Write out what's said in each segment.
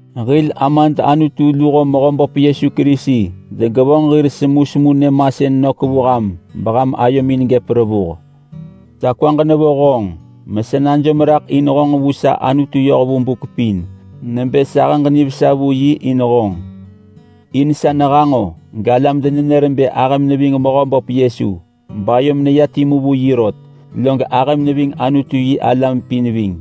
Hil Amad Anutu luho Mehöböp Yesu Kerisi degevonġ hir semusemu nyëmasën nök vu ham beham ayomin gëp revuh. Sa kwaġ nevo honġ mesa najom raḳ in honġ vu sa Anutu yoh vu buk pin nebë sahëġ nivesa vu yi in honġ. In sa nehanġo galam denenër bë ahëm neving Mehöböp Yesu, bayom neya timu vu yi rot, log ahëm neving Anutu-yi-alam pin ving.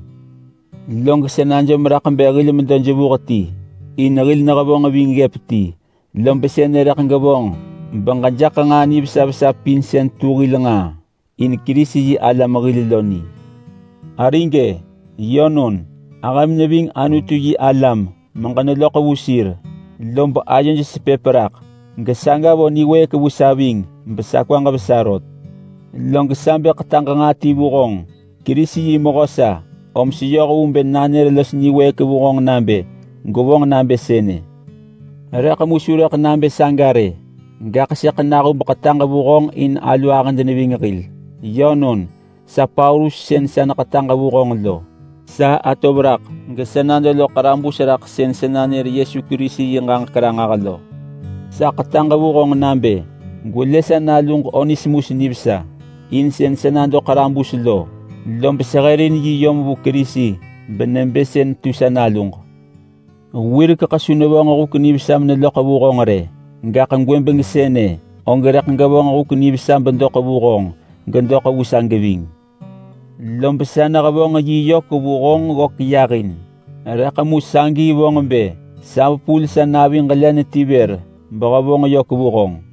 Log sa najom raḳ bë hil medo jevuh ti, in hil nehevonġ ving ggëp ti. Lob sënë rëḳ gevonġ beġejaḳ nġaa nivesa vesa pin sën tu hil nġaa in Kerisi-yi-alam hil lo ni. Arig-e, yönon! Ahëm neving Anutu-yi-alam meġeneloḳ vu sir lob ayoj sepëp raḳ. Gesaga vo niwëëk vu sa ving besa kwaġ vesa rot. Log sa bë ḳetaġ nġaa ti vu honġ. Kerisi yi mehö sa, om seyoh vu bë nanër los niwëëk vu honġ nabë gwevonġ nabë sënë. Rëḳ mu su rëḳ nabë saga rë, gaḳ sëḳ nahub ḳetaġ vu honġ in alu ahëd neving hil. Yönon, sa Paulus sën sa neḳetaġ vu honġ lo! Sa atov raḳ, gesa nado loḳ ḳarabus raḳ sën sa nanër Yesu Kerisi yi ġaġek ranġah lo. Sa ḳetaġ vu honġ nabë: Gwelë sa naluġ Onesimus nivesa. In sën sa nado ḳarabus lo, lob sehërin yi yom vu Kerisi benebë sën tu sa naluġ. Wirekeḳ su nevonġ huk nivesa meneloḳ vu honġ rë, gaḳ gwëbeng sënë og rëḳ gevonġ huk nivesa bedoḳ vu honġ gesa geving. Lob sa nehevonġ yi yök vu honġ ggök yahin, rëḳ mu sagi vonġ bë sa vepul sa naviġ len ti vër behevonġ yök vu honġ.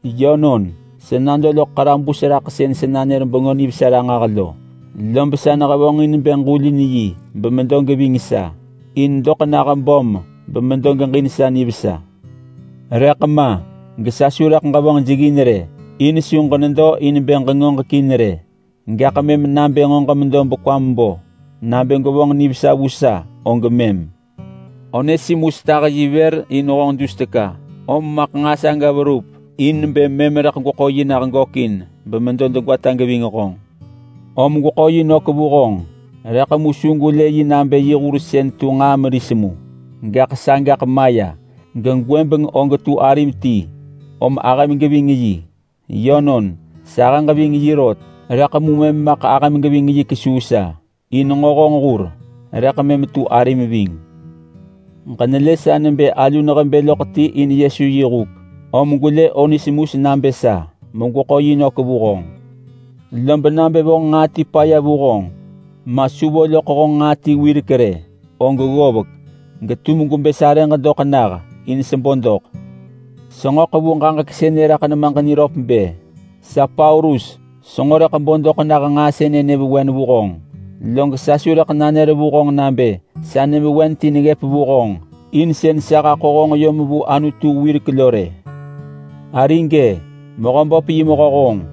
Yönon, sa nado loḳ ḳarabus raḳ sën sa nanër Bengö Nivesa ranġah, lob sa nehevonġin bë ġulin yi bemedo geving sa in doḳ nah böm bemedo geġin sa nivesa. Rëḳ ma gesa su rëḳ ġevonġ jeggin rë, in su ġenedo in bë ġengoġekin rë. Gaḳ mëm nabë nġo ġemedo bekwam bo nabë gwevonġ nivesa vu sa, og mëm. Onesimus tah yi vër in honġ dus teka, om maḳ nġaa saga verup in bë mëm rëḳ gweḳo yi nah gökin bemedo degwata geving honġ. Om gweḳo yi nök vu honġ, rëḳ mu su gwelë yi nabë hur sën tu nġaa meris mu. Gaḳ sagaḳ maya gegwëbeng og tu arim ti, om ahëm geving yi. Yönon, sahëġ ving yi rot, rëḳ mu mëm maḳ ahëm geving yi kesuu sa, in nġo honġ hur rëḳ mëm tu arim ving. Ġenelë sa nebë alu nehebë loḳ ti in Yesu yi huk, om gwelë Onesimus nabë sa, megweḳo yi nök vu honġ. Lob nabë vonġ nġaa ti paya vu honġ, ma su vo loḳ honġ nġaa ti wirek rë, og ggovek, getum gwebë sarëġ doḳ nah in sebo doḳ. Senġo ḳevu ġaġek sënë raḳ nemaġ niröp bë, sa Paulus senġo rëḳ bo doḳ nah nġaa sënë nyëvewen vu honġ. (Log sa su rëḳ nanër vu honġ nabë sa nyëvewen ti neggëp vu honġ in sën sa haḳo honġ yom vu Anutu wirek lo rë.) Arig-e! Mehöböp yi mehö honġ,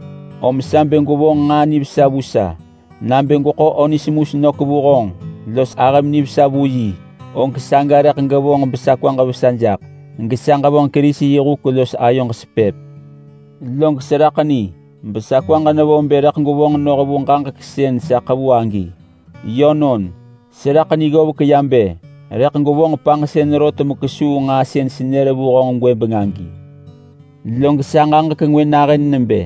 om sa bë gwevonġ nġaa nivesa vu sa. Nabë gweḳo Onesimus nök vu honġ los ahëm nivesa vu yi, og saga rëḳ gevonġ besa kwaġ vesa jaḳ gesa ġevonġ Kerisi yi huk los ayoġ sepëp. Log seraḳ ni besa kwaġ nevo bë rëḳ gwevonġ noh vu ġaġek sën sa ḳevu agi. Yönon, seraḳ ni ggovek ya bë rëḳ gwevonġ panġsën rot mekesuu nġaa sën senër vu honġ gwëbeng agi. Log sa ġaġek ngwë nahën nebë: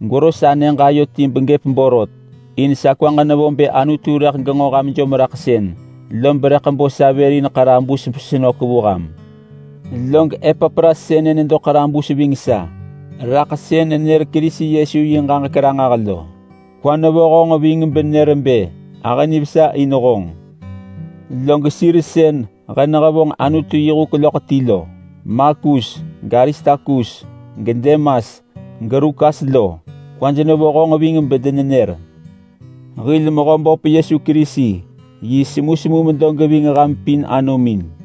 Gwero sa nyëġ ayo ti begëp borot, in sa kwaġ nevo bë Anutu rëḳ genġo ham jomraḳsën, lob rëḳ bo sa vër besenök vu ham. Log Epapras sënë nedo ḳarabus ving sa raḳ sën nenër Kerisi Yesu yi ġaġek ranġah lo. Kwa nevo honġ ving benër bë ahë nivesa in honġ. Log sir sën he nehevonġ Anutu yi huk loḳ ti lo, Markus, gAristarkus, geDemas, geLukas lo, kwaj nevo honġ ving bedenenër. Hil Mehöböp Yesu Kerisi yi semusemu medo geving ham pin anomin.